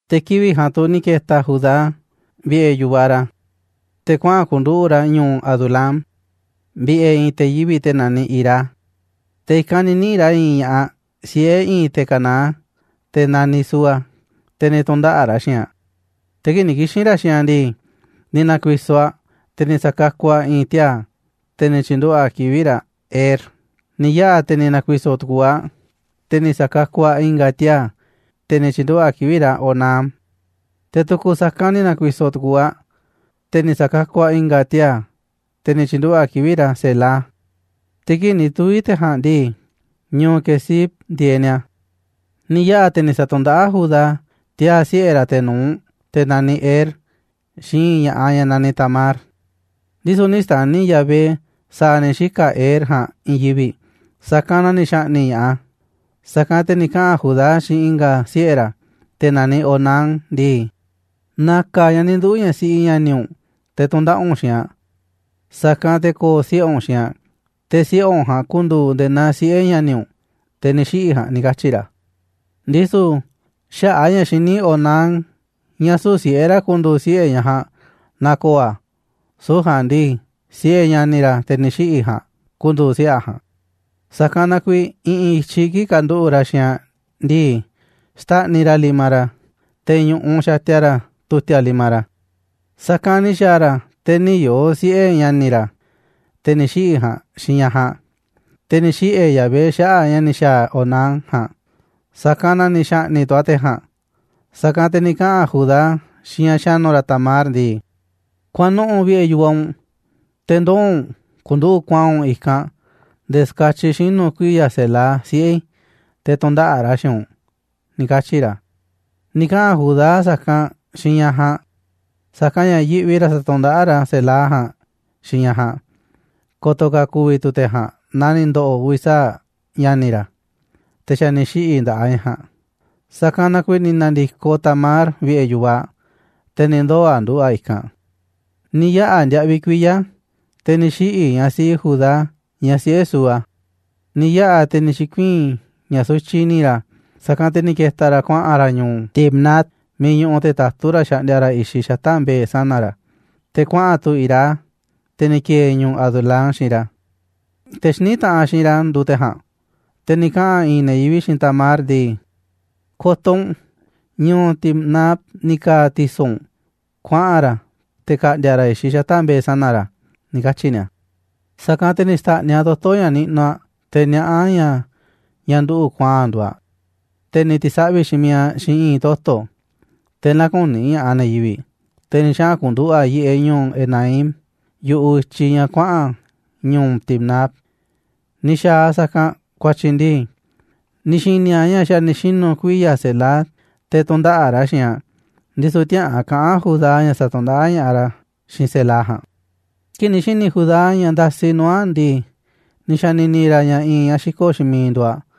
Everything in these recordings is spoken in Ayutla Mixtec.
Te̱ kivi̱ꞌ ja̱a̱nꞌ tu̱ ni̱ ke̱ta̱ Judá vi̱ꞌe̱ yu̱vaꞌ ra̱, te̱ kuaꞌa̱n ku̱nduꞌu̱ꞌ ra̱ ñu̱u̱ Adulám vi̱ꞌe̱ i̱i̱n te̱ yivi̱ꞌ te̱ naniꞌ Hirá. Te̱ i̱kanꞌ ni̱ niꞌi̱ꞌ ra̱ i̱i̱n ña̱ꞌaꞌ siꞌe̱ i̱i̱n te̱ Canaán, te̱ naniꞌ Súa, te̱ ni̱ tu̱ndaꞌa̱ꞌ ra̱ xiinꞌ aꞌ. Te̱ kii̱ꞌ ni̱ kixi̱n ra̱ xiinꞌ aꞌ ndii, ni̱ na̱ku̱i̱so̱ aꞌ, te̱ ni̱ sa̱kakuꞌ aꞌ i̱i̱n tiaa̱, te̱ ni̱ tyi̱nduꞌu̱ꞌ aꞌ kivi̱ꞌ ra̱ Er. Ni̱ yaꞌa̱ te̱ ni̱ na̱ku̱i̱so̱ tu̱ku̱u̱ aꞌ, te̱ ni̱ sa̱kakuꞌ aꞌ i̱nga̱ tiaa̱, te̱ ni̱ tyi̱nduꞌu̱ꞌ aꞌ kivi̱ꞌ ra̱ Onán. Te̱ tu̱ku̱ sa̱kanꞌ ni̱ na̱ku̱i̱so̱ tu̱ku̱u̱ aꞌ, te̱ ni̱ sa̱kakuꞌ aꞌ i̱nga̱ tiaa̱, te̱ ni̱ tyi̱nduꞌu̱ꞌ aꞌ kivi̱ꞌ ra̱ Selá. Te̱ kii̱ꞌ ni̱ tuvi̱ te̱ ja̱a̱nꞌ ndii, ñu̱u̱ Quezib ndieeꞌ ni̱a̱. Ni̱ yaꞌa̱ te̱ ni̱ sa̱tu̱ndaꞌáꞌ Judá tiaa̱ siꞌe̱ ra̱, te̱ nu̱uꞌ, te̱ naniꞌ Er, xiinꞌ i̱i̱n ña̱ꞌaꞌ ñaꞌ naniꞌ Tamar. Ndisu̱ nï̱ xta̱ni̱ Yahvé sa̱a̱ ni̱ xika̱ Er ja̱a̱nꞌ i̱i̱n yivi̱ꞌ, sa̱kanꞌ na ni̱ xa̱ꞌni̱ꞌ ña̱ꞌaꞌ a̱. Sa̱kanꞌ te̱ ni̱ kaꞌa̱n Judá xiinꞌ i̱nga̱ siꞌe̱ ra̱, te̱ naniꞌ Onán ndii: ―Na̱ka̱ ñaꞌ ni̱ nduu̱ ñaꞌ siꞌi ña̱ni̱ u̱nꞌ te̱ tu̱ndaꞌa̱ꞌ u̱nꞌ xiinꞌ aꞌ, sa̱kanꞌ te̱ ko̱o̱ siꞌe̱ u̱nꞌ xiinꞌ aꞌ, te̱ siꞌe̱ u̱nꞌ ja̱a̱nꞌ ku̱ndu̱u̱ nde̱e̱ naa siꞌe̱ ña̱ni̱ u̱nꞌ, te̱ ni̱ xiꞌi̱ ja̱a̱nꞌ ―ni̱ katyi̱ ra̱. Ndisu̱ xaꞌa̱ꞌ a̱ ña̱ xiní Onán ña̱ süu̱ꞌ siꞌe̱ ra̱ ku̱ndu̱u̱ siꞌe̱ ñaꞌ ja̱a̱nꞌ naaꞌ ko̱o̱ a̱, süu̱ꞌ ja̱a̱nꞌ ndii, siꞌe̱ ña̱ni̱ ra̱, te̱ ni̱ xiꞌi̱ ja̱a̱nꞌ, ku̱ndu̱u̱ siꞌe̱ a̱ ja̱a̱nꞌ, sa̱kanꞌ na kuiiꞌ i̱ꞌi̱n i̱tyiꞌ kii̱ꞌ kanduꞌu̱ꞌ ra̱ xiinꞌ aꞌ ndii, xtáꞌniꞌ ra̱ limaꞌ ra̱ te̱ ñu̱ꞌuꞌ xatia ra̱ tu̱ti̱a̱ limaꞌ ra̱. Sa̱kanꞌ ni̱ xa̱a̱ ra̱ te̱ nï̱ yoo̱ siꞌe̱ ña̱ni̱ ra̱, te̱ ni̱ xiꞌi̱ ja̱a̱nꞌ xiinꞌ ñaꞌ ja̱a̱nꞌ. Te̱ ni̱ xiꞌe̱ Yahvé xaꞌa̱ꞌ ña̱ ni̱ xa̱a̱ Onán ja̱a̱nꞌ, sa̱kanꞌ na ni̱ xa̱ꞌni̱ꞌ tu̱ a̱ te̱ ja̱a̱nꞌ. Sa̱kanꞌ te̱ ni̱ kaꞌa̱n Judá xiinꞌ ñaꞌ xa̱nu̱ ra̱ Tamar ndii: ―Kuaꞌa̱n nuꞌu̱ꞌ vi̱ꞌe̱ yu̱vaꞌ u̱nꞌ, te̱ ndoo̱ u̱nꞌ ku̱nduꞌu̱ꞌ kuaa̱nꞌ u̱nꞌ i̱kanꞌ nde̱e̱ ska̱tyiꞌ xinu̱ kuiya̱ Selá, siꞌe̱ i̱, te̱ tu̱ndaꞌa̱ꞌ ra̱ xiinꞌ u̱nꞌ ―ni̱ katyi̱ ra̱. Ni̱ kaꞌa̱n Judá sa̱kanꞌ xiinꞌ ñaꞌ ja̱a̱nꞌ, sa̱kanꞌ ña̱ yiꞌvi ra̱ sa̱tu̱ndaꞌáꞌ ra̱ Selá ja̱a̱nꞌ xiinꞌ ñaꞌ ja̱a̱nꞌ ko̱to̱ ka̱ ku̱vi̱ tu̱ te̱ ja̱a̱nꞌ naa ni̱ ndo̱ꞌo̱ uvi̱ sa̱aꞌ ña̱ni̱ ra̱, te̱ xa̱ ni̱ xiꞌi̱ nda̱ꞌaꞌ ñaꞌ ja̱a̱nꞌ. Sa̱kanꞌ na kuiiꞌ ni̱ na̱ndi̱koꞌ Tamar vi̱ꞌe̱ yu̱vaꞌ aꞌ, te̱ ni̱ ndoo̱ aꞌ nduꞌu̱ꞌ aꞌ i̱kanꞌ. Ni̱ yaꞌa̱ ndiaꞌviꞌ kuiya̱, te̱ ni̱ xiꞌi̱ ñaꞌ siꞌi Judá, ñaꞌ siꞌe̱ Súa. Ni̱ yaꞌa̱ te̱ ni̱ xi̱kuii̱n ña̱ sutyiꞌ i̱ni̱ ra̱, sa̱kanꞌ te̱ ni̱ ke̱ta̱ ra̱ kuaꞌa̱n ra̱ ñu̱u̱ Timnat miiꞌ ñuꞌuꞌ te̱ tatú ra̱ xaꞌndia ra̱ i̱xiꞌ xata̱ꞌ mbe̱e̱ sana̱ ra̱, te̱ kuaꞌa̱n tu̱ Hirá, te̱ ni̱ ki̱e̱e̱ ñu̱u̱ Adulám, xiinꞌ ra̱, te̱ xiní taꞌanꞌ xiinꞌ ra̱ nduuꞌ te̱ ja̱a̱nꞌ. Te̱ ni̱ kaꞌa̱n i̱i̱n ne̱ yivi̱ꞌ xiinꞌ Tamar ndii: ―Ko̱to̱ u̱nꞌ, ñu̱u̱ Timnat ni̱ ka̱a̱ ti̱so̱ u̱nꞌ kuaꞌa̱n ra̱, te̱ ka̱ꞌndi̱a̱ ra̱ i̱xiꞌ xata̱ꞌ mbe̱e̱ sana̱ ra̱ ―ni̱ katyi̱ ni̱a̱. Sa̱kanꞌ te̱ ni̱ xta̱ꞌniꞌ aꞌ toto̱ ña̱ niꞌnuꞌ aꞌ te̱ niaꞌá aꞌ ña̱ ñaꞌ nduꞌu̱ꞌ kuaa̱nꞌ nduuꞌ aꞌ, te̱ ni̱ ti̱saꞌvi̱ xiinꞌ miiꞌ aꞌ xiinꞌ i̱i̱n toto̱, te̱ nä̱ku̱ni̱ ña̱ꞌaꞌ ne̱ yivi̱ꞌ, te̱ ni̱ xaꞌa̱n ku̱nduꞌu̱ꞌ aꞌ yiꞌeꞌ ñu̱u̱ Enaim yu̱ꞌuꞌ i̱tyiꞌ ña̱ kuaꞌa̱n ñu̱u̱ Timnat. Ni̱ xa̱a̱ aꞌ sa̱kanꞌ ku̱a̱tyi̱ ndii, ni̱ xi̱ni̱ aꞌ ña̱ xa̱ ni̱ xinu̱ kuiya̱ Selá te̱ tu̱ndaꞌa̱ꞌ ra̱ xiinꞌ aꞌ, ndisu̱ tiäꞌa̱an kaꞌa̱n Judá ña̱ sa̱tu̱ndaꞌáꞌ ña̱ꞌaꞌ ra̱ xiinꞌ Selá ja̱a̱nꞌ. Kii̱ꞌ ni̱ xi̱ni̱ Judá ña̱ ndasi nuu̱ꞌ aꞌ ndii, ni̱ xa̱ni̱ni̱ ra̱ ña̱ i̱i̱n ñaꞌ xiko̱ꞌ xiinꞌ miiꞌ nduuꞌ aꞌ.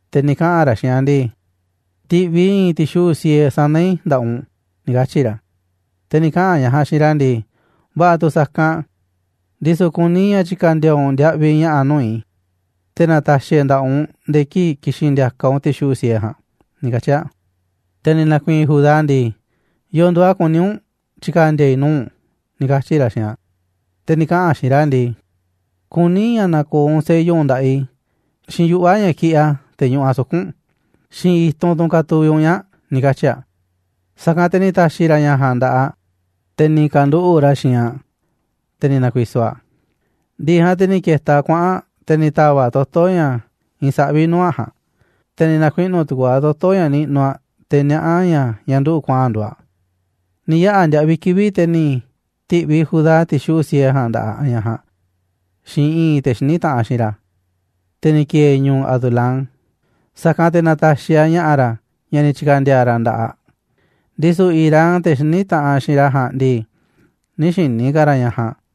Te̱ ni̱ kaꞌa̱n ra̱ xiinꞌ aꞌ ndii: ―Ti̱ꞌviꞌ i̱ i̱i̱n ti̱xuꞌu̱ꞌ siee sana̱ i̱ nda̱ꞌaꞌ u̱nꞌ ―ni̱ katyi̱ ra̱. Te̱ ni̱ kaꞌa̱n ñaꞌ ja̱a̱nꞌ xiinꞌ ra̱ ndii: ―Va̱ꞌa̱ tu̱ sa̱kanꞌ, ndisu̱ kuní i̱ ña̱ tyi̱ka̱ndi̱a̱ u̱nꞌ ndiaꞌviꞌ ña̱ꞌa̱ nuu̱ꞌ i̱, te̱ na̱ta̱xi̱ e̱ nda̱ꞌaꞌ u̱nꞌ nde̱e̱ kii̱ꞌ ki̱xi̱n ndi̱a̱ka̱ u̱nꞌ ti̱xuꞌu̱ꞌ siee ja̱a̱nꞌ ―ni̱ katyi̱ aꞌ. Te̱ ni̱ na̱ku̱i̱i̱n Judá ndii: ―¿Yo̱o̱ nduuꞌ a̱ kuní u̱nꞌ tyi̱ka̱ndi̱a̱ i̱ nuu̱ꞌ u̱nꞌ? ―ni̱ katyi̱ ra̱ xiinꞌ aꞌ. Te̱ ni̱ kaꞌa̱n aꞌ xiinꞌ ra̱ ndii: ―Kuní i̱ ña̱ na̱ko̱o̱ u̱nꞌ sello u̱nꞌ nda̱ꞌaꞌ i̱, xiinꞌ yuꞌva̱ ña̱ kiꞌiꞌ a̱, te̱ ñuꞌuꞌ a̱ suku̱nꞌ u̱nꞌ, xiinꞌ i̱tunꞌ tunꞌ katuviꞌ u̱nꞌ ñaa̱ꞌ ―ni̱ katyi̱ aꞌ. Sa̱kanꞌ te̱ ni̱ ta̱xi̱ ra̱ ña̱ ja̱a̱nꞌ nda̱ꞌaꞌ aꞌ, te̱ ni̱ ka̱nduꞌu̱ꞌ ra̱ xiinꞌ aꞌ, te̱ ni̱ na̱ku̱i̱so̱ aꞌ. Ndi̱ꞌi̱ ja̱a̱nꞌ te̱ ni̱ ke̱ta̱ aꞌ kuaꞌa̱n aꞌ, te̱ ni̱ ta̱va̱ꞌ aꞌ toto̱ ña̱ iinꞌ saꞌví nuu̱ꞌ aꞌ ja̱a̱nꞌ, te̱ ni̱ na̱kuiꞌnu̱ tu̱ku̱u̱ aꞌ toto̱ ña̱ niꞌnuꞌ aꞌ, te̱ niaꞌá aꞌ ña̱ ñaꞌ nduꞌu̱ꞌ kuaa̱nꞌ nduuꞌ aꞌ. Ni̱ yaꞌa̱ ndiaꞌviꞌ kivi̱ꞌ, te̱ ni̱ ti̱ꞌviꞌ Judá ti̱xuꞌu̱ꞌ siee ja̱a̱nꞌ nda̱ꞌaꞌ ña̱ꞌaꞌ ja̱a̱nꞌ xiinꞌ i̱i̱n te̱ xiní taꞌanꞌ xiinꞌ ra̱, te̱ ni̱ ki̱e̱e̱ ñu̱u̱ Adulám, sa̱kanꞌ te̱ na̱ta̱xi̱ aꞌ ña̱ꞌa̱ ra̱, ña̱ ni̱ tyi̱ka̱ndi̱a̱ ra̱ nda̱ꞌaꞌ aꞌ, ndisu̱ Hirá, te̱ xiní taꞌanꞌ xiinꞌ ra̱ ja̱a̱nꞌ ndii, nï̱ xi̱ni̱ ka̱ ra̱ ñaꞌ ja̱a̱nꞌ.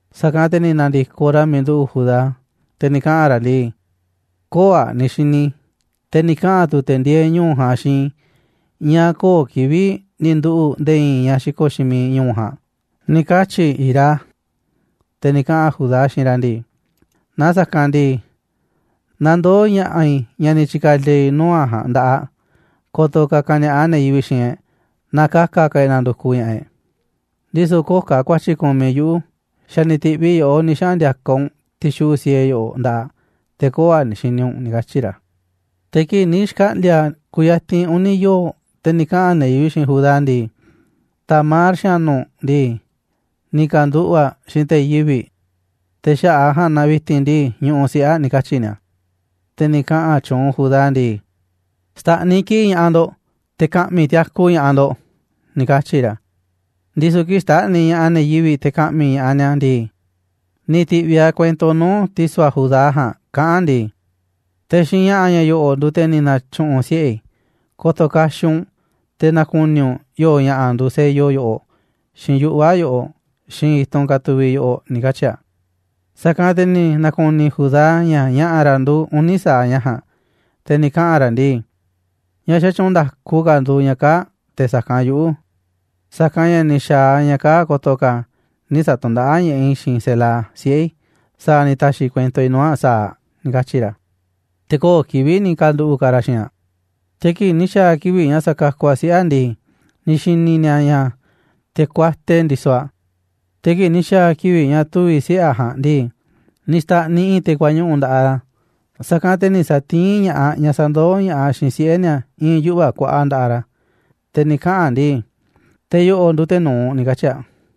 Sa̱kanꞌ te̱ ni̱ na̱ndi̱koꞌ ra̱ miiꞌ nduꞌu̱ꞌ Judá, te̱ ni̱ kaꞌa̱n ra̱ ndii: ―Köo̱ꞌ aꞌ ni̱ xi̱ni̱ i̱, te̱ ni̱ kaꞌa̱n tu̱ te̱ ndieeꞌ ñu̱u̱ ja̱a̱nꞌ xiinꞌ i̱ ña̱ köo̱ꞌ kivi̱ꞌ ni̱ nduꞌu̱ꞌ nde̱e̱ i̱i̱n ñaꞌ xiko̱ꞌ xiinꞌ miiꞌ ñu̱u̱ ja̱a̱nꞌ ―ni̱ katyi̱ Hirá. Te̱ ni̱ kaꞌa̱n Judá xiinꞌ ra̱ ndii: ―Na sa̱kanꞌ ndii, na ndoo̱ ña̱ꞌa̱ i̱ ña̱ ni̱ tyi̱ka̱ndi̱a̱ i̱ nuu̱ꞌ aꞌ ja̱a̱nꞌ nda̱ꞌaꞌ aꞌ, ko̱to̱ ka̱ ka̱ni̱a̱ꞌa ne̱ yivi̱ꞌ xiinꞌ e̱ꞌ naaꞌ ka̱ka̱ ka̱ e̱ꞌ nandukuꞌ ña̱ꞌaꞌ e̱ꞌ, ndisu̱ köo̱ꞌ ka̱ ku̱a̱tyi̱ kumiꞌ yuꞌu̱, xa̱ ni̱ ti̱ꞌviꞌ i̱ yoꞌó ni̱ xaꞌa̱n ndi̱a̱ka̱ u̱nꞌ ti̱xuꞌu̱ꞌ siee yoꞌoꞌ nda̱ꞌaꞌ aꞌ, te̱ köo̱ꞌ aꞌ ni̱ xini u̱nꞌ ―ni̱ katyi̱ ra̱. Te̱ kii̱ꞌ ni̱ xkaꞌndi̱a̱ kuyatinꞌ uni̱ yoo̱ꞌ, te̱ ni̱ kaꞌa̱n ne̱ yivi̱ꞌ xiinꞌ Judá ndii: ―Tamar, xa̱nu̱ u̱nꞌ ndii, ni̱ ka̱nduꞌu̱ꞌ aꞌ xiinꞌ te̱ yivi̱ꞌ, te̱ xaꞌa̱ꞌ a̱ ja̱a̱nꞌ na vi̱ti̱n ndii, ñuꞌuꞌ siꞌe̱ aꞌ ―ni̱ katyi̱ ni̱a̱. Te̱ ni̱ kaꞌa̱n tyuunꞌ Judá ndii: ―Xta̱ꞌniꞌ kiꞌi̱ꞌ ña̱ꞌaꞌ ndo̱ꞌ, te̱ ka̱ꞌmi̱ tiaku ña̱ꞌaꞌ ndo̱ꞌ ―ni̱ katyi̱ ra̱. Ndisu̱ kii̱ꞌ xtáꞌniꞌ ña̱ꞌaꞌ ne̱ yivi̱ꞌ te̱ ka̱ꞌmi̱ ña̱ꞌaꞌ ni̱a̱ ndii, ni̱ ti̱ꞌviꞌ aꞌ kuento nuu̱ꞌ ti̱so̱ aꞌ Judá ja̱a̱nꞌ kaꞌán aꞌ ndii: ―Te̱ xiinꞌ ña̱ꞌa̱ ña̱ yo̱ꞌo̱ nduuꞌ te̱ ni̱ na̱tyu̱ꞌu̱n siꞌe̱ i̱. Ko̱to̱ kaxiꞌ u̱nꞌ te̱ na̱ku̱ni̱ u̱nꞌ yo̱o̱ ña̱ꞌa̱ nduuꞌ sello yoꞌoꞌ, xiinꞌ yuꞌva̱ yoꞌoꞌ, xiinꞌ i̱tunꞌ katuviꞌ yoꞌoꞌ ―ni̱ katyi̱ aꞌ. Sa̱kanꞌ te̱ ni̱ na̱ku̱ni̱ Judá ña̱ ña̱ꞌa̱ ra̱ nduuꞌ uni̱ sa̱aꞌ ña̱ ja̱a̱nꞌ, te̱ ni̱ kaꞌa̱n ra̱ ndii: ―Ñaꞌ xatyuunꞌ nda̱ku ka̱ nduuꞌ ñaꞌ kaa̱ꞌ te̱ sa̱kanꞌ yuꞌu̱, sa̱kanꞌ ña̱ ni̱ xa̱a̱ aꞌ ña̱ kaa̱ꞌ ko̱to̱ ka̱ nï̱ sa̱tu̱ndaꞌáꞌ ña̱ꞌaꞌ i̱ xiinꞌ Selá, siꞌe̱ i̱, sa̱a̱ ni̱ ta̱xi̱ kuento i̱ nuu̱ꞌ aꞌ sa̱aꞌ ―ni̱ katyi̱ ra̱. Te̱ köo̱ꞌ kivi̱ꞌ ni̱ ka̱nduꞌu̱ꞌ ka̱ ra̱ xiinꞌ aꞌ. Te̱ kii̱ꞌ ni̱ xa̱a̱ kivi̱ꞌ ña̱ sa̱kakuꞌ aꞌ siꞌe̱ aꞌ ndii, ni̱ xi̱ni̱ ni̱a̱ ña̱ te̱ kuate ndisoꞌ aꞌ. Te̱ kii̱ꞌ ni̱ xa̱a̱ kivi̱ꞌ ña̱ tuvi̱ siꞌe̱ aꞌ ja̱a̱nꞌ ndii, ni̱ xta̱ꞌniꞌ i̱i̱n te̱ kuañuꞌu̱ nda̱ꞌaꞌ ra̱. Sa̱kanꞌ te̱ ni̱ sa̱tiín ña̱ꞌaꞌ ñaꞌ sandoó ña̱ꞌaꞌ xiinꞌ siꞌe̱ ni̱a̱ i̱i̱n yuꞌva̱ kuaꞌa̱ꞌ nda̱ꞌaꞌ ra̱, te̱ ni̱ kaꞌa̱n aꞌ ndii: ―Te̱ yo̱ꞌo̱ nduuꞌ te̱ nu̱uꞌ ―ni̱ katyi̱ aꞌ.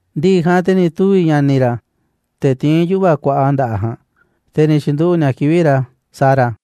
Ndi̱ꞌi̱ ja̱a̱nꞌ te̱ ni̱ tuvi̱ ña̱ni̱ ra̱, te̱ tiín yuꞌva̱ kuaꞌa nda̱ꞌaꞌ ja̱a̱nꞌ, te̱ ni̱ tyi̱nduꞌu̱ꞌ ni̱a̱ kivi̱ꞌ ra̱ Zara.